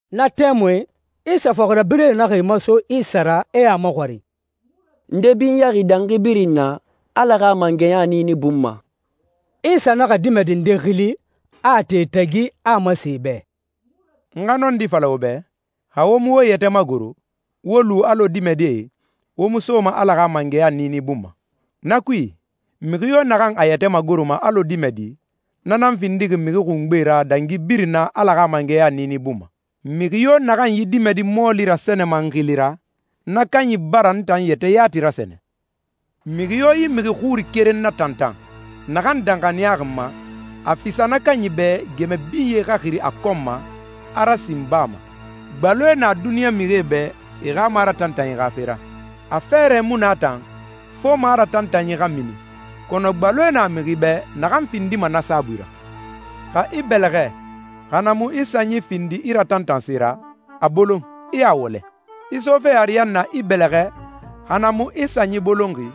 Na tɛmui Isa fɔxirabirɛe naxa e maso Isa ra, e a maxɔrin, «Nde binyaxi dangi birin na Ala xa mangɛya niini bun ma?» Isa naxa dimɛdi nde xili, a a ti e tagi, a a masen e bɛ, «N xa nɔndi fala wo bɛ, xa wo mu wo yɛtɛ magoro, wo lu alɔ dimɛdie, wo mu soma Ala xa mangɛya niini bun ma. Na kui, mixi yo naxan a yɛtɛ magoroma alɔ dimɛdi, na nan findixi mixi xungbe ra dangi birin na Ala xa mangɛya niini bun ma. Mixi yo naxan yi dimɛdi mɔɔli rasɛnɛma n xili ra, na kanyi bara n tan yɛtɛ yati rasɛnɛ.» «Mixi yo yi mixi xuri keren natantan, naxan danxaniyaxi n ma, a fisa na kanyi bɛ gɛmɛ binye xa xiri a kɔn ma, a rasin baa ma. Gbaloe na duniɲa mixie bɛ e xa maratantanyi xa fe ra. A fɛɛrɛ mu na tan, fo maratantanyi xa mini, kɔnɔ gbaloe na mixi bɛ naxan findima na saabui ra. Xa i bɛlɛxɛ, xa na mu i sanyi findi i ratantanse ra, a bolon, i a wɔlɛ. I sofe ariyanna i bɛlɛxɛ, xa na mu i sanyi bolonxi,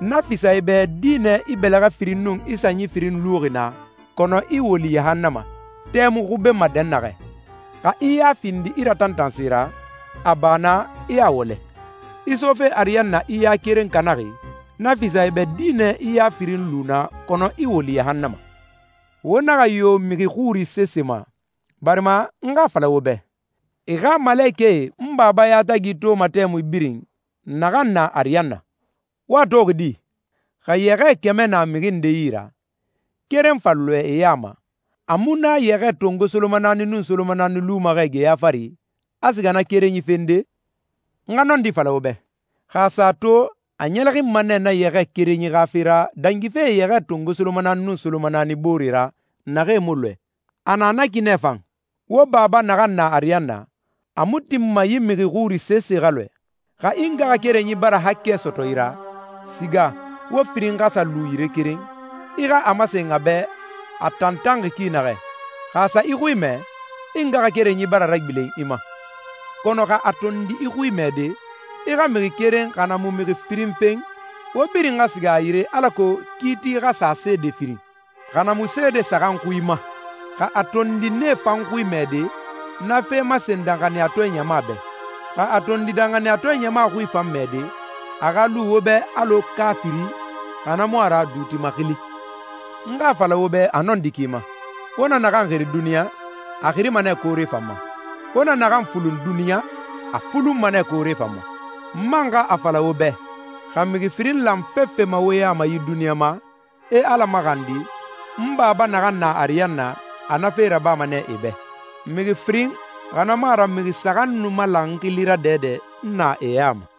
na fisa i bɛ dinɛ i bɛlɛxɛ firin nun i sanyi firin luxi na, kɔnɔ i woli yahannama, tɛ mu xubenma dɛnnaxɛ. Xa i ya findi i ratantanse ra, a ba na, i a wɔlɛ. I sofe ariyanna i ya keren kanaxi, na fisa i bɛ dinɛ i ya firin lu na, kɔnɔ i woli yahannama.» «Wo naxa yo yi mixi xuri sese ma, barima n xa a fala wo bɛ, e xa malekɛe n Baba yatagi toma tɛmui birin, naxan na ariyanna.» «Wo a toxi di? Xa yɛxɛɛ kɛmɛ na mixi nde yi ra, keren fa lɔɛ e ya ma, a mu na yɛxɛɛ tongo solomanaani nun solomanaani luma xɛ geya fari, a siga na kerenyi fende? N xa nɔndi fala wo bɛ, xa a sa a to, a ɲɛlɛxinma nɛ na yɛxɛɛ kerenyi xa fe ra, dangife yɛxɛɛ tongo solomanaani nun solomanaani boore ra, naxee mu lɔɛ. A na na ki nɛ fan, wo Baba naxan na ariyanna, a mu tinma yi mixi xuri sese xa lɔɛ.» «Xa i ngaxakerenyi bara haakɛ sɔtɔ i ra, siga, wo firin xa sa lu yire keren, i xa a masen a bɛ a tantanxi ki naxɛ. Xa a sa i xui mɛ, i ngaxakerenyi bara ragbilen i ma. Kɔnɔ xa a tondi i xui mɛde, i xa mixi keren xa na mu mixi firin fen, wo birin xa siga a yire alako kiiti xa sa seede firin, xa na mu seede saxan xui ma. Xa a tondi nee fan xui mɛde, na fe masen danxaniyatɔɛ ɲama bɛ. Xa a tondi danxaniyatɔɛ ɲama xui fan mɛde, a xa lu wo bɛ alɔ kaafiri, xa na mu a ra, duuti maxili. N xa a fala wo bɛ a nɔndi ki ma, wo na naxan xiri duniɲa, a xirima nɛ koore fan ma. Wo na naxan fulun duniɲa, a fulunma nɛ koore fan ma. N man xa a fala wo bɛ, xa mixi firin lan fefe ma wo ya ma yi duniɲa ma, e Ala maxandi, n Baba naxan na ariyanna, a na fe rabama nɛ e bɛ. Mixi firin, xa na mu a ra mixi saxan nu malan n xili ra dɛdɛ, n na e ya ma.»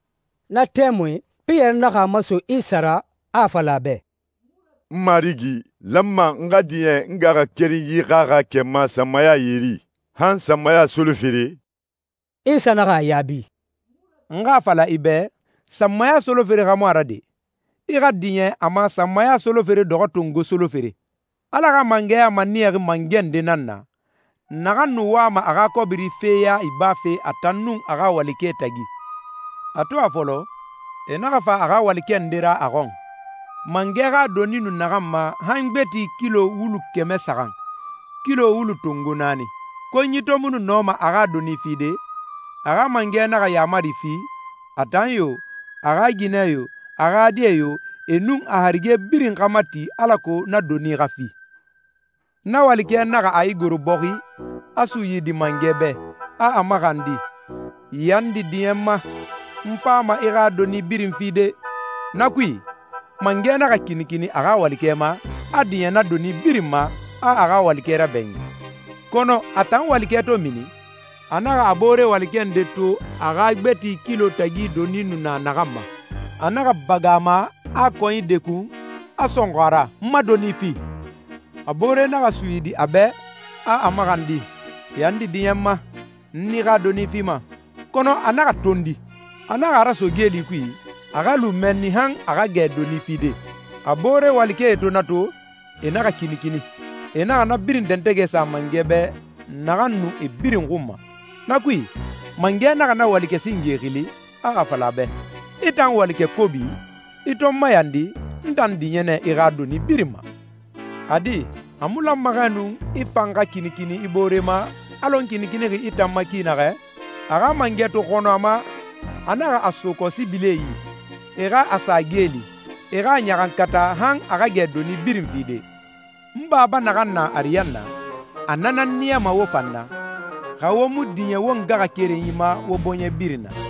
Na tɛmui, Piyɛri naxa a maso Isa ra, a a fala a bɛ, «N Marigi, n lanma n xa diɲɛ n ngaxakerenyi xa haakɛ ma sanmaya yeri? Han sanmaya solofere?» Isa naxa a yaabi, «N xa a fala i bɛ, sanmaya solofere xa mu a ra de! I xa diɲɛ a ma sanmaya solofere dɔxɔ tongo solofere.» «Ala xa mangɛya maniyaxi mangɛ nde nan na, naxan nu wama a xa kɔbiri fe ya ibafe a tan nun a xa walikɛe tagi. A to a fɔlɔ, e naxa fa a xa walikɛ nde ra a xɔn, mangɛ xa doni nu naxan ma han gbeti kilo wulu kɛmɛ saxan, kilo wulu tongo naani. Konyi to mu nu nɔma a xa doni fide, a xa mangɛ naxa yaamari fi, a tan yo, a xa ginɛ yo, a xa die yo, e nun a harige birin xa mati alako na doni xa fi. Na walikɛ naxa a igoro bɔxi, a suyidi mangɛ bɛ, a a maxandi, ‹Yandi, diɲɛ n ma. N fama i xa doni birin fide.› Na kui, mangɛ naxa kinikini a xa walikɛ ma, a diɲɛ na doni birin ma, a a xa walikɛ rabɛɲin.» «Kɔnɔ a tan walikɛ to mini, a naxa a boore walikɛ nde to a xa gbeti kilo tagi doni nu na naxan ma. A naxa bagan a ma, a a kɔnyi dekun, a sɔnxɔ a ra, ‹N ma doni fi!› A boore naxa suyidi a bɛ, a a maxandi, ‹Yandi, diɲɛ n ma. N i xa doni fima.› Kɔnɔ a naxa tondi. A naxa a raso geeli kui, a xa lu mɛnni han a xa gɛ doni fide.» «A boore walikɛe to na to, e naxa kinikini. E naxa na birin dɛntɛgɛ sa mangɛ bɛ naxan nu e birin xun ma. Na kui, mangɛ naxa na walikɛ singe xili, a a fala a bɛ, ‹I tan walikɛ kobi! I to n mayandi, n tan diɲɛ nɛ i xa doni birin ma. A di, a mu lanma xɛ nu i fan xa kinikini i boore ma, alɔ n kinikinixi i tan ma ki naxɛ?› A xa mangɛ to xɔnɔ a ma, a naxa a so kɔsibilie yi, e xa a sa geeli, e xa a ɲaxankata han a xa gɛ doni birin fide.» «N Baba naxan na ariyanna, a na nan niyama wo fan na, xa wo mu diɲɛ wo ngaxakerenyi ma wo bɔɲɛ birin na.»